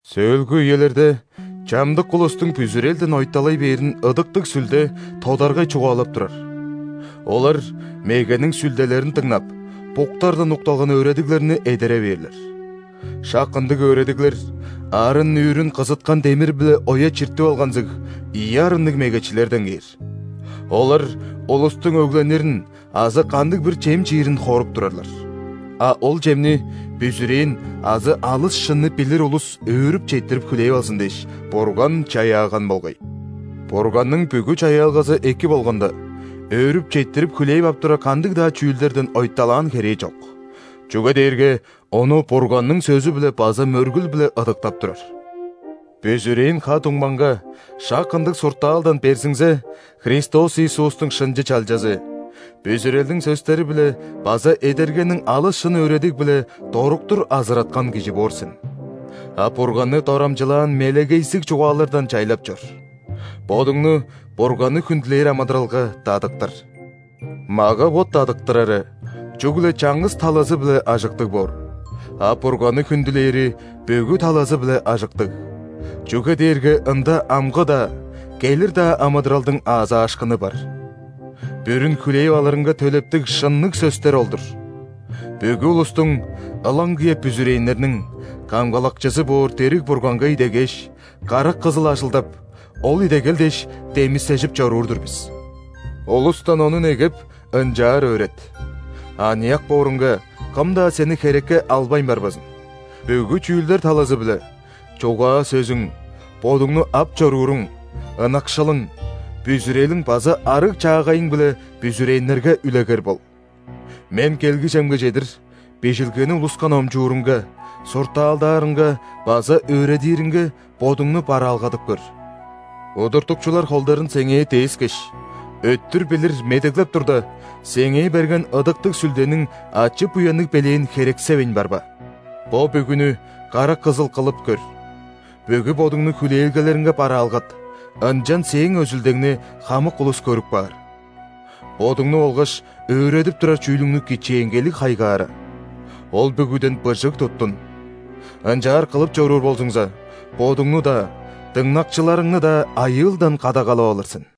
Сөөлгү үелерде чамдык улустуң бүзүрелден ойталай бээрин Ыдыктыг Сүлде тодаргай чугаалап турар. Олар мегениң сүлделерин дыңнап, буктардан укталган өөредиглерни эдере бээрлер. Шак ындыг өөредиглер арын-нүүрүн кызыткан демир-биле оя чиртип алганзыг, ийи арынныг мегечилерден кээр. Олар улустуң өгленирин азы кандыг-бир чем чиирин хоруп турарлар. А ол чемни, бүзүрээн азы алыс шынны билир улус өөрүп четтирип хүлээп алзын дээш, Бурган чаяаган болгай. Бурганның бүгү чаяалгазы эки болганда, өөрүп четтирип хүлээп ап турар кандыг-даа чүүлдерден ойталаан херээ чок. Чүге дээрге ону Бурганның сөзү-биле база мөргүл-биле ыдыктап турар. Бүзүрээн ха-дуңмаңга шак ындыг суртаалдан берзиңзе, Христос Иисустуң шынчы чалчазы: бүзүрелдиң сөстери-биле база эдергениң алыс шын өөредиг-биле доруктур азыраткан кижи боор сен. А Бурганны дорамчылаан мелегейзиг чугаалардан чайлап чор, бодуңну Бурганны хүндүлээр амыдыралга дадыктыр. Мага-бот дадыктырары чүгле чаңгыс талазы-биле ажыктыг боор, а Бурганны хүндүлээри бүгү талазы-биле ажыктыг, чүге дээрге ында амгы-даа, келир-даа амыдыралдың аазаашкыны бар. Бүрүн хүлээп алырынга төлептиг шынныг сөстер ол-дур. Бүгү улустуң, ылаңгыя бүзүрээннерниң, Камгалакчызы боор дириг Бурганга идегээш, карак кызыл ажылдап, ол идегел дээш, демисежип чоруур-дур бис. Улустан ону негеп, ынчаар өөрет. Аныяк бооруңга, кым-даа сени херекке албайн барбазын. Бүгү чүүлдер талазы-биле: чугаа-сөзүң, бодуңну ап чорууруң, ынакшылың, бүзүрелиң база арыг-чаагайың-биле бүзүрээннерге үлегер бол. Мен келгижемге чедир, Бижилгени улуска номчуурунга, суртаалдаарынга база өөредиринге бодуңну бараалгадып көр. Удуртукчулар холдарын сеңээ дээскеш, өттүр билир медеглеп турда, сеңээ берген Ыдыктыг Сүлдениң ачы-буянныг белээн херексевейн барба. Бо бүгүнү карак кызыл кылып көр, бүгү бодуңну хүлээлгелериңге бараалгат, ынчан сээң өзүлдеңни хамык улус көрүп каар. Бодуңну болгаш өөредип турар чүүлүңнү кичээнгейлиг хайгаара. Ол бүгүден быжыг туттун. Ынчаар кылып чоруур болзуңза, бодуңну-даа, дыңнакчыларыңны-даа айыылдан кадагалап алыр сен.